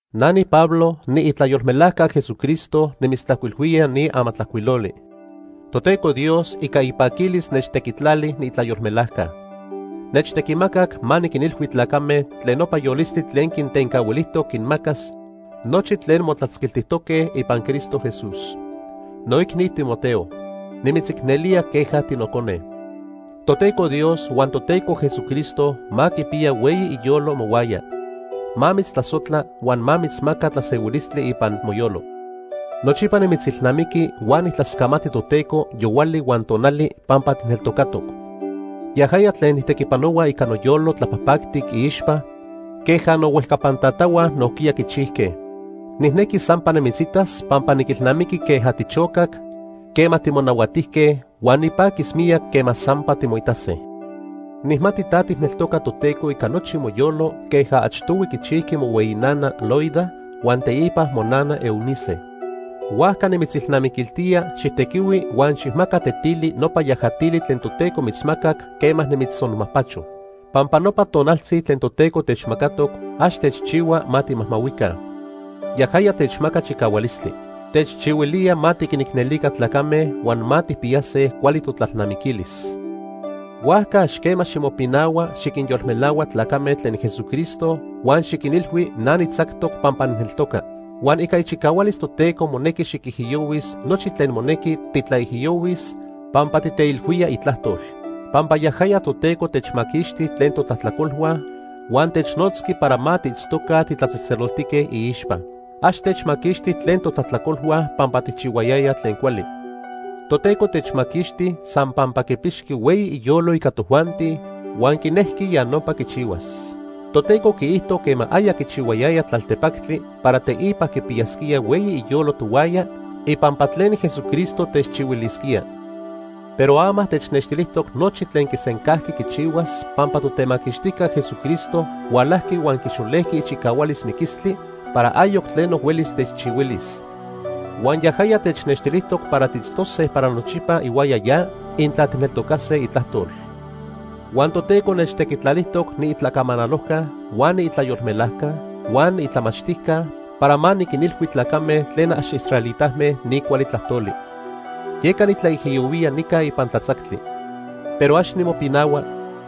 Na niPablo, niitlayolmelajca Jesucristo nimitztlajcuilhuía ni amatlajcuiloli. Toteco Dios ica ipaquilis nechtequitlali niitlayolmelajca. Nechtequimacac ma niquinilhui tlacame tlen nopa yolistli tlen quintencahuilijtoc quinmacas nochi tlen motlatzquiltijtoque ipan Cristo Jesús. Noicni Timoteo, nimitzicnelía queja tinocone. Toteco Dios huan Toteco Jesucristo ma quipiya hueyi iyolo mohuaya. Ma mitztlasojtla huan ma mitzmaca tlasehuilistli ipan moyolo. Nochipa nimitzilnamiqui huan nijtlascamati Toteco yohuali huan tonali pampa tijneltocatoc. Yajaya tlen nijtequipanohua ica noyolo tlapajpactic iixpa queja nohuejcapan tatahua nojquiya quichijque. Nijnequi sampa nimitzitas pampa niquilnamiqui queja tichocac quema timonahuatijque huan nipaquis miyac quema sampa timoitase. Nijmati ta tijneltoca Toteco ica nochi moyolo queja achtohui quichijqui mohueyi nana, Loida, huan teipa monana, Eunice. Huajca nimitzilnamiquiltía xijtequihui huan xijmaca tetili nopa yajatili tlen Toteco mitzmacac quema nimitztzonmajpacho. Pampa nopa tonaltzi tlen Toteco techmacatoc ax techchihua ma timajmahuica. Yajaya techmaca chicahualistli. Techchihuilía ma tiquinicnelica tlacame huan ma tijpiyase cuali totlalnamiquilis. Huajca ax quema ximopinahua xiquinyolmelahua tlacame tlen Jesucristo huan xiquinilhui na nitzactoc pampa nijneltoca. Huan ica ichicahualis Toteco monequi xiquijiyohuis nochi tlen monequi titlaijiyohuis pampa titeilhuía itlajtol. Pampa yajaya Toteco techmaquixti tlen totlajtlacolhua huan technotzqui para ma tiitztoca titlatzejtzeloltique iixpa. Ax techmaquixti tlen totlajtlacolhua pampa tijchihuayayaj tlen cuali. Toteco techmaquixti san pampa quipixqui hueyi iyolo ica tojuanti huan quinejqui ya nopa quichihuas. Toteco quiijto quema aya quichihuayaya tlaltepactli para teipa quipiyasquía hueyi iyolo tohuaya ipampa tlen Jesucristo techchihuilisquía. Pero ama technextilijtoc nochi tlen quisencajqui quichihuas pampa Totemaquixtijca Jesucristo hualajqui huan quixolejqui ichicahualis miquilistli para ayoc tleno huelis techchihuilis. Huan yajaya technextilijtoc para tiitztose para nochipa ihuaya ya intla tijneltocase itlajtol. Huan Toteco nechtequitlalijtoc niitlacamanalojca huan niitlayolmelajca huan niitlamachtijca para ma niquinilhui tlacame tlen ax israelitame ni cuali tlajtoli. Yeca nitlaijiyohuía nica ipan tlatzactli. Pero ax nimopinahua,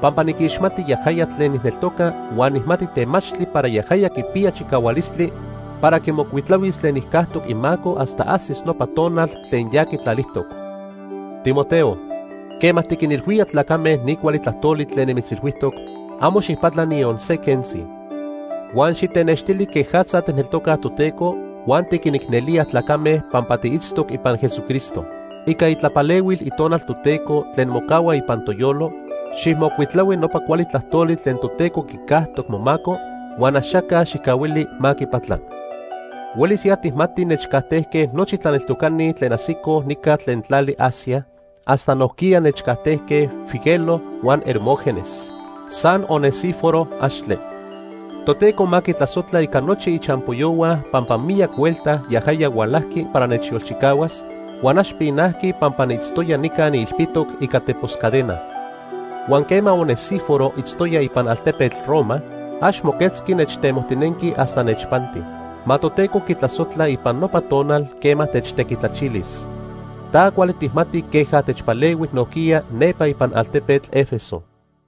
pampa niquixmati yajaya tlen nijneltoca huan nijmati temachtli para yajaya quipiya chicahualistli para quimocuitlahuis tlen nijcajtoc imaco hasta ajsis nopa tonal tlen ya quitlalijtoc. Timoteo, quema tiquinilhuía tlacame ni cuali tlajtoli tlen nimitzilhuijtoc, amo xijpatla niyon se quentzi. Huan xitenextili quejatza tijneltoca Toteco huan tiquinicnelía tlacame pampa tiitztoc ipan Jesucristo. Ica itlapalehuil Itonal Toteco tlen mocahua ipan toyolo, xijmocuitlahui nopa cuali tlajtoli tlen Toteco quicajtoc momaco, huan axaca xijcahuili ma quipatla. Huelis ya tijmati nechcajtejque nochi tlaneltocani tlen ajsicoj nica tlen tlali Asia, hasta nojquiya nechcajtejque Figelo huan Hermógenes. San Onesíforo, axtle. Toteco ma quitlasojtla ica nochi ichampoyohua pampa miyac huelta yajaya hualajqui para nechyolchicahuas, huan ax pinajqui pampa niitztoya nica niilpitoc ica tepos cadena. Huan quema Onesíforo itztoya ipan altepetl Roma, ax moquetzqui nechtemojtinenqui hasta nechpanti. Ma Toteco quitlasojtla ipan nopa tonal quema techtequitlachilis. Ta cuali tijmati queja techpalehui nojquiya nepa ipan altepetl Éfeso.